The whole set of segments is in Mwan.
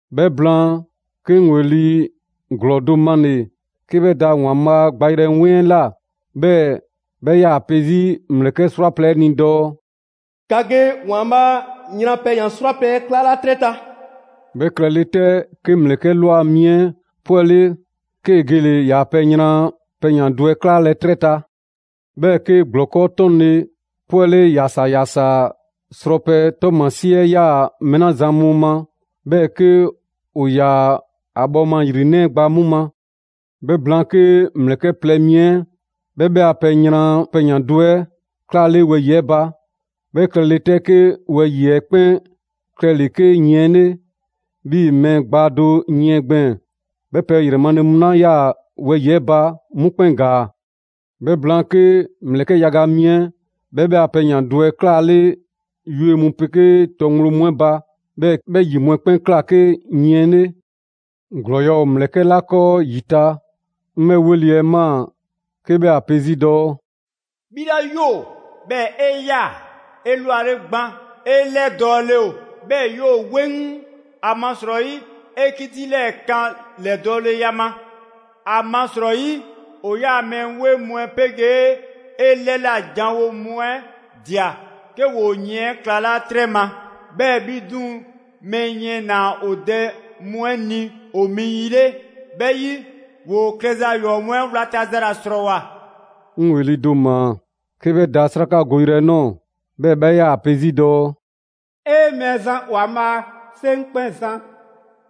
'Bhɛ blaan, 'ke 'ŋ ‑weli' ‑glɔɔ do male‑ 'ke 'bhɛ da ‑Waanbhaa' gbayrɛ 'weŋ 'ɛ ꞊la; 'bhɛɛ‑ 'bhɛ 'yaa‑ pe 'zi ‑mlɛkɛ' 'srwaplɛ‑ 'ɛ ni dɔɔ: «‑Ka ge ‑Waanbhaa' a yran pɛyan‑ 'srwaplɛ‑ 'ɛ 'klaala 'trɛ ta!» 'Bhɛ klɛle 'tɛ, 'ke ‑mlɛkɛ' ꞊lwa mi 'ɛ 'pwɛle, 'kee gele‑ ‑yaa' pɛ yran pɛyan‑ do 'ɛ 'klaalɛ 'trɛ ta. 'Bhɛɛ‑ 'ke ‑gblɔkɔ' 'tɔnle‑ 'pwɛle ‑yasaa ‑yasaa srɔpɛ 'ɛ 'tɔɔmasie 'ɛ 'yaa‑ mɛɛ 'la zan mu ma, 'bhɛɛ‑ 'ke ‑o ‑yaa ‑a bhɔɔma ‑yrinɛ' 'ɛ gba 'mu ma. 'Bhɛ blaan, 'ke ‑mlɛkɛ' plɛ mi 'ɛ 'bhɛ 'bhɛ a pɛ yran pɛyan‑ do 'ɛ 'klaale wɛyi‑ 'ɛ ba. 'Bhɛ klɛle 'tɛ 'ke wɛyi‑ 'ɛ 'kpɛn klɛle‑ 'ke yiɛn 'le, 'bhii‑ mɛɛ gbaa do yiɛn gbɛɛn‑, 'bhɛɛ‑ pɛ ‑yrɛ male mu 'la 'yaa‑ wɛyi‑ 'ɛ ba, 'mu 'kpɛn ‑gaa. 'Bhɛ blaan, 'ke ‑mlɛkɛ' yaga mi 'ɛ 'bhɛ 'bhɛ a pɛ yran pɛyan‑ do 'ɛ 'klaale yue mu 'pegee tɔ ŋgblo mu 'ɛ ba. 'Bhɛɛ‑ 'bhɛ ‑yi mu 'ɛ 'kpɛn ꞊kla 'ke yiɛn 'le. ‑Glɔɔya' ‑o ‑mlɛkɛ' 'la 'kɔɔ ‑yi ta, 'ŋ 'bhɛ 'weli‑ 'ɛ ꞊maa 'ke 'bhɛ ‑a pe 'zi dɔɔ: «'Bhi 'la ‑yoo, 'bhɛɛ‑ 'e 'yaa‑ 'elwale gban, 'e 'lɛdɔɔle ‑o, 'bhɛɛ‑ 'yoo‑ 'weŋ, ‑amasrɔyi 'e 'kiti 'lɛɛ‑ ꞊kaan 'lɛdɔɔleya ma. ‑Amasrɔyi, ‑o 'yaa‑ mɛɛ 'weŋ mu 'ɛ 'pegee 'e 'lɛla‑ ‑janwo' mu 'ɛ ꞊dia 'ke ‑woo 'yiɛn 'ɛ 'klalaa 'trɛ ma. 'Bhɛɛ‑ 'bhi 'duŋ‑ mɛɛ yiɛn ‑naa ‑o dɛ mu 'ɛ ni ‑o mi yi 'le. 'Bhɛ 'yi, ‑woo klɛza ‑yɔɔ' mu 'ɛ 'wlata‑ za ‑la ‑srɔɔwoa'!» 'Ŋ ‑weli' do ꞊maa 'ke 'bhɛ da 'srakagoyrɛ 'ɛ ꞊nɔɔ, 'bhɛɛ‑ 'bhɛ 'yaa‑ ‑a pe 'zi dɔɔ: «'E! Mɛɛzan ‑Waanbhaa', 'Seŋkpɛnzan,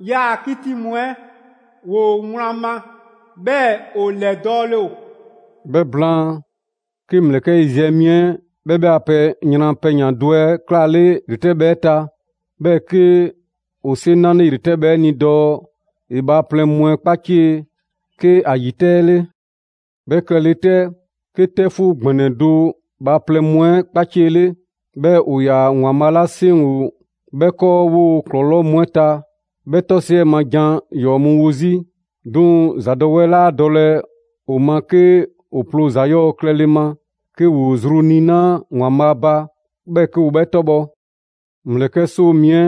'yaa‑ 'kiti mu 'ɛ ‑woo wlan ma, 'bhɛɛ‑ ‑o ‑lɛdɔɔle ‑o!» 'Bhɛ blaan, 'ke ‑mlɛkɛ' yiziɛ mi 'ɛ 'bhɛ 'bhɛ a pɛ yran pɛyan‑ do 'ɛ 'klaale ‑yretɛbhɛ 'ɛ ta, 'bhɛɛ‑ 'ke ‑o 'seŋ 'nale ‑yretɛbhɛ 'ɛ ni dɔɔ ‑e bhaaplɛŋ mu 'ɛ 'kpacie 'ke ‑a ‑yi 'tɛ 'ɛ 'le. 'Bhɛ klɛle 'tɛ, 'ke 'tɛfuu ‑gbɛnɛ do bhaaplɛŋ mu 'ɛ 'kpaciele, 'bhɛɛ‑ ‑o ‑yaa ‑Waanbhaa' 'la 'seŋ ‑o 'bhɛ 'kɔɔ 'woo‑ ‑klɔlɔɔ' mu 'ɛ ta 'bhɛ 'tɔsiɛ ma jan ‑yɔɔ' mu 'wo 'zi. 'Duŋ‑ ‑zadɔwɛɛ 'laa dɔlɛ ‑o ma 'ke ‑o ploo ‑za 'yɔɔ‑ klɛle ma, 'ke ‑woo zru niinaa' ‑Waanbhaa' ba, 'bhɛɛ‑ 'ke ‑o 'bhɛ 'tɔbhɔ‑. ‑Mlɛkɛ' 'soo mi 'ɛ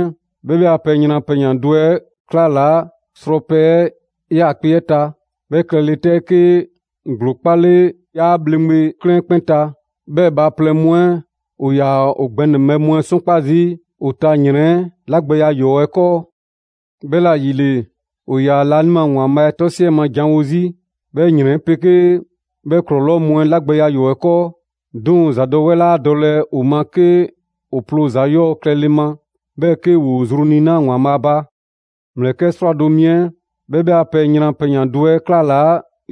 'bhɛ 'bhɛ a pɛ yran pɛyan‑ do 'ɛ 'klalaa srɔpɛ 'ɛ 'yaakpe‑ 'ɛ ta. 'Bhɛ klɛle 'tɛ, 'ke ‑gblo 'kpale ‑yaa' ‑bhleŋgbe 'klɛɛn 'ɛ 'kpɛn ta. 'Bhɛɛ‑ bhaaplɛŋ mu 'ɛ 'yaa‑ ‑o gbɛnɛbhɛ mu 'ɛ 'sɔnkpa zii' ‑o ta ‑yrɛn 'ɛ 'lagbɛya ‑yɔɔ' 'ɛ 'kɔɔ. 'Bhɛla‑ ‑yile, ‑o ‑yaa laanima ‑Waanbhaa' 'tɔ 'siɛ ma jan mu wo 'zi, 'bhɛ ‑yrɛn 'ɛ 'pegee 'bhɛ ‑gblɔkɔ' mu 'ɛ 'lagbɛya ‑yɔɔ' 'ɛ 'kɔɔ. 'Duŋ‑ ‑zadɔwɛɛ 'laa dɔlɛ ‑o ma 'ke ‑o ploo ‑za 'yɔɔ‑ klɛle ma, 'bhɛɛ‑ 'ke ‑woo zru niinaa' ‑Waanbhaa' ba. ‑Mlɛkɛ' 'srwado‑ mi 'ɛ 'bhɛ 'bhɛ a pɛ yran pɛyan‑ do 'ɛ 'klalaa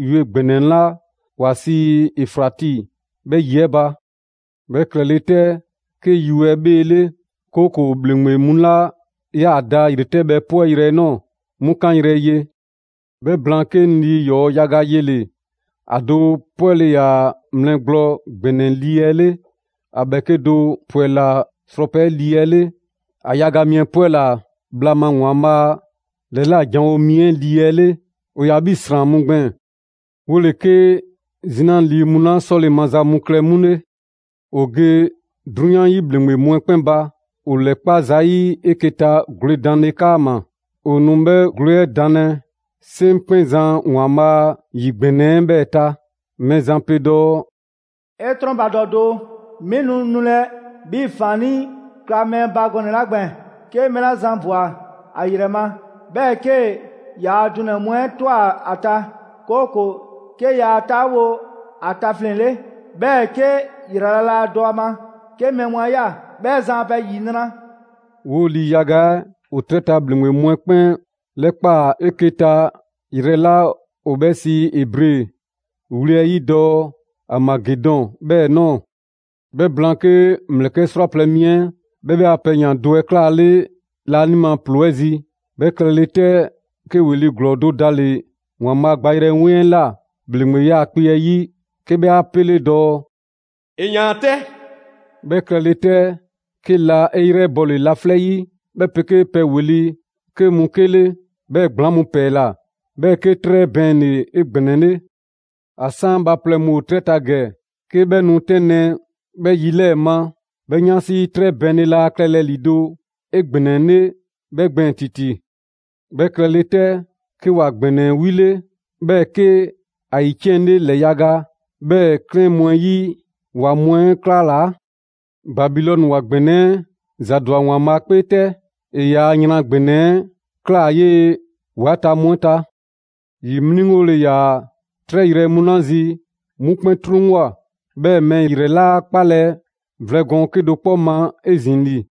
yue ‑gbɛnɛ 'la ‑wa sii Efrati 'bhɛ 'yi 'ɛ ba. 'Bhɛ klɛle 'tɛ, 'ke yue 'ɛ 'bheele; 'kooko‑ ‑bhleŋgbe mu 'la 'yaa‑ da ‑yretɛbhɛ 'pwɛyrɛ‑ nɔɔ‑, 'mu 'kanyrɛ‑ ye. 'Bhɛ blaan, 'ke 'ŋ lii ‑yɔɔ' yaga yele‑. ‑A do ‑pwɛla mlɛ gblɔ ‑gbɛnɛ 'ɛ lii 'ɛ 'le, ‑a ‑bhɛɛke' do ‑pwɛla srɔpɛ 'ɛ lii 'ɛ 'le, 'bhɛɛ‑ ‑a yaga mi 'ɛ 'pwɛla‑ bhla ma ‑Waanbhaa' ‑lɛla' janwo mi 'ɛ lii 'ɛ 'le. ‑O ‑yaa 'bhii‑ ‑sran mu gbɛɛn‑. 'Wole‑ 'ke 'zina lii mu 'la 'sɔle‑ maza mu klɛ 'mu 'le. ‑O ge 'drunyan 'yi ‑bhleŋgbe mu 'ɛ 'kpɛn ba, ‑o ‑lɛkpa' zayi' 'eke‑ ta gwledanle 'kaama‑. ‑O nu 'bhɛ gwle 'ɛ danlɛ 'Seŋkpɛnzan ‑Waanbhaa' a yi ‑gbɛnɛ 'ɛ 'bhɛɛ‑ ta. Mɛɛzan pe dɔɔ: «'E 'trɔnbadɔ doo, 'mi nu nulɛ 'bhii‑ ‑faannii' kla mɛɛ ba gɔnɛ‑ 'la gbɛɛn‑! 'Ke mɛɛ 'la zan ꞊bwa ‑a 'yrɛ ma, 'bhɛɛ‑ 'kee‑ ‑yaa' dunɛ‑ mu 'ɛ ꞊twa ‑a ta; 'kooko‑ 'ke yaa 'taawo‑ ‑a tafleŋ‑ 'le, 'bhɛɛ‑ 'ke ‑yrala' laa dɔ ‑a ma 'ke mɛɛ mu 'a ꞊ya, 'bhɛ zan a pɛ ‑yinra'.» 'Woo lii yaga 'ɛ ‑o 'trɛ ta ‑bhleŋgbe mu 'ɛ 'kpɛn 'lɛkpaa‑ 'eke‑ ta yrɛ 'la ‑o 'bhɛ sii Ebre wli 'ɛ 'yi dɔɔ: «Aamagedɔn» 'bhɛɛ‑ ꞊nɔɔ. 'Bhɛ blaan, 'ke ‑mlɛkɛ' 'srwaplɛ‑ mi 'ɛ 'bhɛ 'bhɛ a pɛ yran pɛyan‑ do 'ɛ 'klaale laanima ‑ploo 'ɛ zi. 'Bhɛ klɛle 'tɛ, 'ke ‑weli' ‑glɔɔ do dale‑ ‑Waanbhaa' gbayrɛ 'weŋ 'ɛ ꞊la ‑bhleŋgbe 'yaakpe‑ 'ɛ 'yi, 'ke 'bhɛ 'a 'pele dɔɔ: «‑E ꞊yaan 'tɛ!» 'Bhɛ klɛle 'tɛ, 'ke la 'e 'yrɛbɔle laflɛ' 'yi, 'bhɛ 'pegee pɛ wli 'ke mu 'kele, 'bhɛɛ‑ ‑gblaŋ' mu ‑pɛɛla, 'bhɛɛ‑ 'ke 'trɛ bɛɛnle‑ 'egbɛnɛle. ‑A 'san bhaaplɛŋ mu ‑o 'trɛ ta ‑gɛ 'ke 'bhɛ nu 'tɛnlɛ‑ 'bhɛ yi 'lɛɛ‑ ma, 'bhɛ 'yansi 'trɛ bɛɛnle laa klɛlɛ ‑lido' 'egbɛnɛle 'bhɛ gbɛɛn‑ ‑titi. 'Bhɛ klɛle 'tɛ, 'ke ‑wa ‑gbɛnɛ 'ɛ 'wile, 'bhɛɛ‑ 'ke ‑a ‑yiciɛnle ‑lɛ yaga; 'bhɛɛ‑ 'klɛɛn mu 'ɛ 'yi ‑wa mu 'ɛ 'klalaa‑. Babilɔni ‑wa ‑gbɛnɛ 'ɛ ‑zadwa ‑Waanbhaa' 'kpee 'tɛ. ‑E ‑yaa' yran ‑gbɛnɛ 'ɛ ꞊klaa 'yee‑ ‑wa 'ɛ ta mu 'ɛ ta. ‑Yi 'mliŋgole ‑yaa 'trɛ yrɛ mu 'la zi, 'mu 'kpɛn 'truŋwoa꞊, 'bhɛɛ‑ mɛɛ ‑yrɛ 'laa 'kpalɛ‑ vlɛ gɔɔn 'kedo‑ 'kpɔ ma 'ezin‑ ‑li.